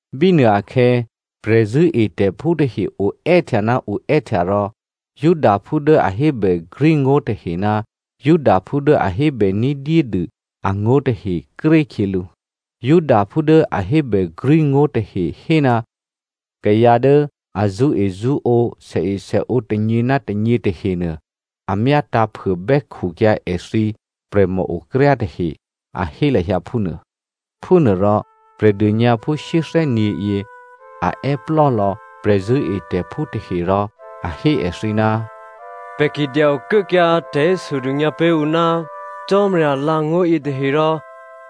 Bínuô akhè̌, prè̤zṳ̂́etè̤phú tahe oè́htya ná oè́htya rò Helleniaphú tahe ná Judaphú dố a hébè ní̤dyédû angó̤ tahe krékhyělǔ. Helleniaphú tahe hé ná kayǎ dố a zṳ́ezṳ́ǒ sèesèǒ tônyě ná tônyě tahenuô a myátǎ̤phuô bè́khukyǎ èthǐ prè̤mòokryá tahe, a hé lahyǎ phúnuô. Phúnuôrò Prè̤dônyǎphú shyéthè́nyě̤yě, a è́plò́ lò̌ prè̤zṳ̂́etè̤phú tahe rò a hé èthǐ, “Pè̤ ki dya-okuốkyǎ tè̤hésodônyǎ pé̤ ǔ ná Cò́marya alǎ̤angó̤ yětahe rò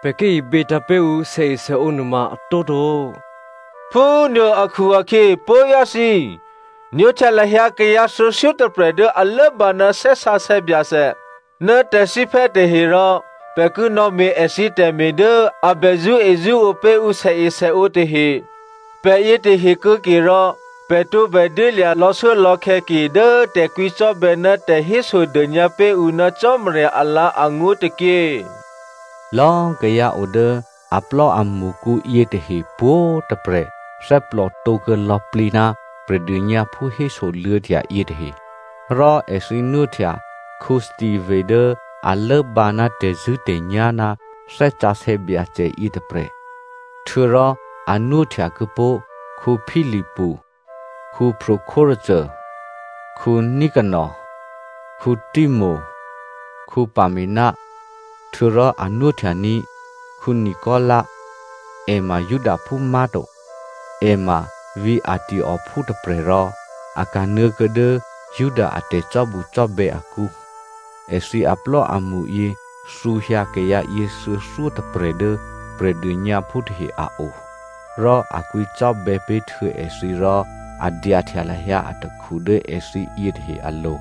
pè̤ ki ibětǎ̤ pé̤ ǔ sèesèǒ nuôma a tǒto. Phúnuô akhu-akhyě puố̤vyá̤ thǐ꤮, nwóhtya lahyǎ kayǎ thuô̌thyótôprè̤ dố a lốbǎ ná Thè́ Sǎsè̌ Byacè ná tè̤thíphè́ tahe rò pè̤ ki nò̌me̤ èthǐ tè̤me̤ dố a bè zṳ́ezṳ́ǒ pé̤ ǔ sèesèǒ tahe. Pè̤ yětahe kuô̌ke rò pè̤ tǒbè dyélya̤ lò̌shuốlò̌khè̌ ke dố tè̤kwǐcò́bè̌ ná tè̤hésodônyǎ pé̤ ǔ ná Cò́marya alǎ̤angó̤ tôkyě.” Lò̌꤮ kayǎ o dố aplò́amṳkǔ yětahe pwǒ̤꤮ tôprè̤ thè́plòtǒ kuô̌ lò̌plǐ ná Prè̤dônyǎphú hésoluô̌htya yětahe, rò èthǐ nwóhtya Stephano dố a lốbǎ ná tè̤zṳ̂́tè̤nyá̤ ná Thè́ Sǎsè̌ Byacè yětôprè̤, htuô̌rò a nwóhtya kuô̌pó̤ Philipu, Prochorus, Nicano, Timon, Pamena. Htuô̌rò a nwóhtyaní̤ Nicolaita, è ma Judaphú má̤to, è ma vǐ̤ Antiokophú tôprè̤ rò a kanuô̌ kuô̌ dố Juda a tè̤cò́bucò́bè̌ akǔ. Èthǐ aplò́amṳyě thǔhyǎ kayǎyě thuô̌thyótôprè̤ dố Prè̤dônyǎphú tahe a o. Rò a kwǐcò́bè̌ pé̤ htuô̌ èthǐ rò a dyahtya lahyǎ atakhu dố èthǐ yětahe alo̤.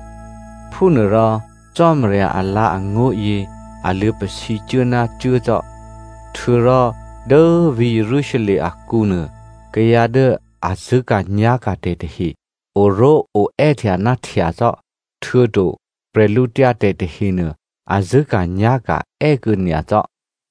Phúnuôrò Cò́marya alǎ̤angó̤yě a luô̌pasǐcuố ná cuố cò́. Htuô̌rò dố vǐ̤ Jerusalem akǔ nuô, kayǎ dố a zṳ̂́ka̤nyá̤ka̤tè̤ tahe oró̤oè́htya ná htya cò́. Htuô̌to bwídu tahenuô, a zṳ̂́ka̤nyá̤ka̤ è́ kuô̌ nyacò́.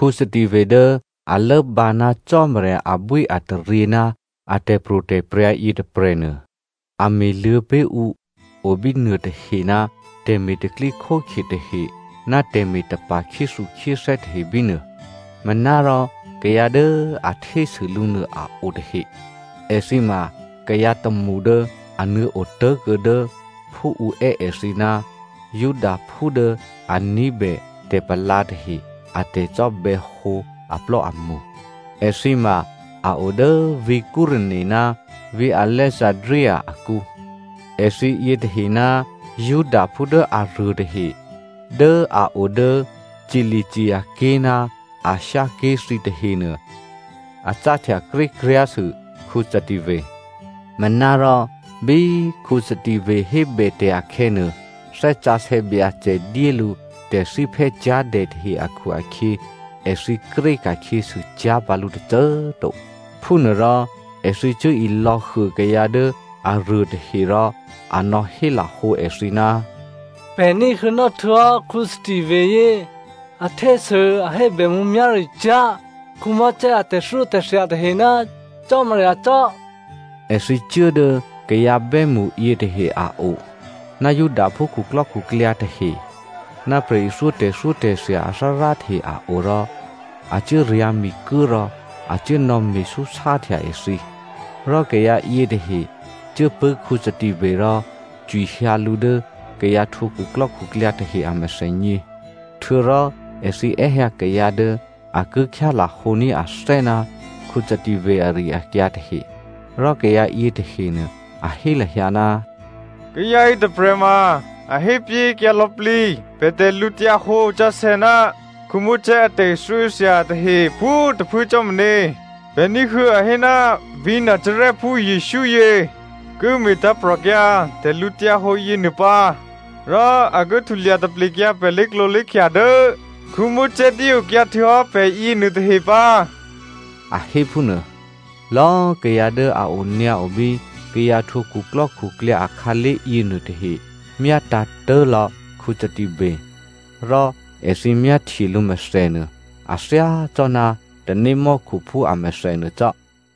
Stephano dố a lốbǎ ná Cò́marya abwíataryě ná a tè̤pro̤tè̤prya̤ yětôprè̤nuô, a me̤luô̌ pé̤ ǔ o bínuô tahe ná tè̤me̤ tè̤pro̤tè̤prya̤ tahe ná tè̤me̤tapa̤ khyéthukhyéthè́ tahe bínuô. Manárò kayǎ dố a htésû lǔ nuô a o tahe. Èthǐ ma kayǎ tômṳ dố a nuô̌ otố̤kuô̌ dố (Phú ǔ è́ èthǐ ná) Judaphú dố a ní̤bè tè̤palǎ tahe a tè̤cò́bè̌hǒ aplò́amṳ. Èthǐ ma a o dố vǐ̤ Cyreneo ná vǐ̤ Alexandria akǔ. Èthǐ yětahe ná Judaphú dố aruôtahe dố a o dố Cilicia ké̤ ná Asia ké̤ thǐ tahenuô, a cáhtya krékryá̤sû Stephano. Manárò bí Stephano hébètè̤ akhè̌nuô, Thè́ Sǎsè̌ Byacè dyé lǔ tè̤thíphè́cyá̤dè tahe akhu-akhyě èthǐ kréka̤khyěsû cyá̤ pǎ lǔ tôcô꤮ to. Phúnuôrò èthǐ cuố ilò̌huô kayǎ dố aruôtahe rò a nò̌hélahǒ èthǐ, “Pè̤ ní̤huô̌nò́ htuô̌hò́ Stephano yě, a htésû, a hébè mǔmyá̤ricyá̤ Mosè a tè̤thyótè̤thya tahe ná Cò́marya cò́.” Èthǐ cuố dố kayǎ bè́mṳ yětahe a o, ná Judaphú khuklò́khuklyǎ tahe, ná prè̤ithyó tè̤thyótè̤thya athárá tahe a o rò a cuố ryǎ̤mikuố rò a cuố nò̌me̤súsáhtya èthǐ. Rò kayǎ yětahe cuố pṳ̂́ Stephano rò cwihyǎ lǔ dố kayǎ htwǒ khuklò́khuklyǎ tahe a mèthènyě. Htuô̌rò èthǐ è́hyǎ kayǎ dố a ki khyálahǒní̤ athè́ ná Stephano ari-akyǎ tahe. Rò kayǎ yětahenuô a hé lahyǎ, “Kayǎ yětôprè̤ ma a hépyéhékyǎ lò̌plǐ pè̤ tè̤lǔhǒdu sǎsè̌ ná Mosè a tè̤thyótè̤thya tahe pwǒ̤꤮ tôphuố cò́ meně. Pè̤ ní̤huô̌ a hé ná vǐ̤ Nazarèphú Jesǔ yě ki me̤tǎ̤prò̤kyǎ tè̤lǔhǒdu yěnuô pǎ rò a ki htulya taplekyǎ pè̤ lé̤klǒlé̤khya dố Mosè dyéokyǎ htuô̌hò́ pè̤ yěnuôtahe pǎ” a hé phúnuô. Lò̌꤮ kayǎ dố a onyǎo bí kayǎ htwǒ khuklò́khuklyǎ akhǎlé̤ yěnuô tahe myátǎ̤tố̤ lò̌ Stephano, rò èthǐ myáhtye lǔ mèthènuô a thyácò́ná tanémò́khuphú amèthè nuô cò́.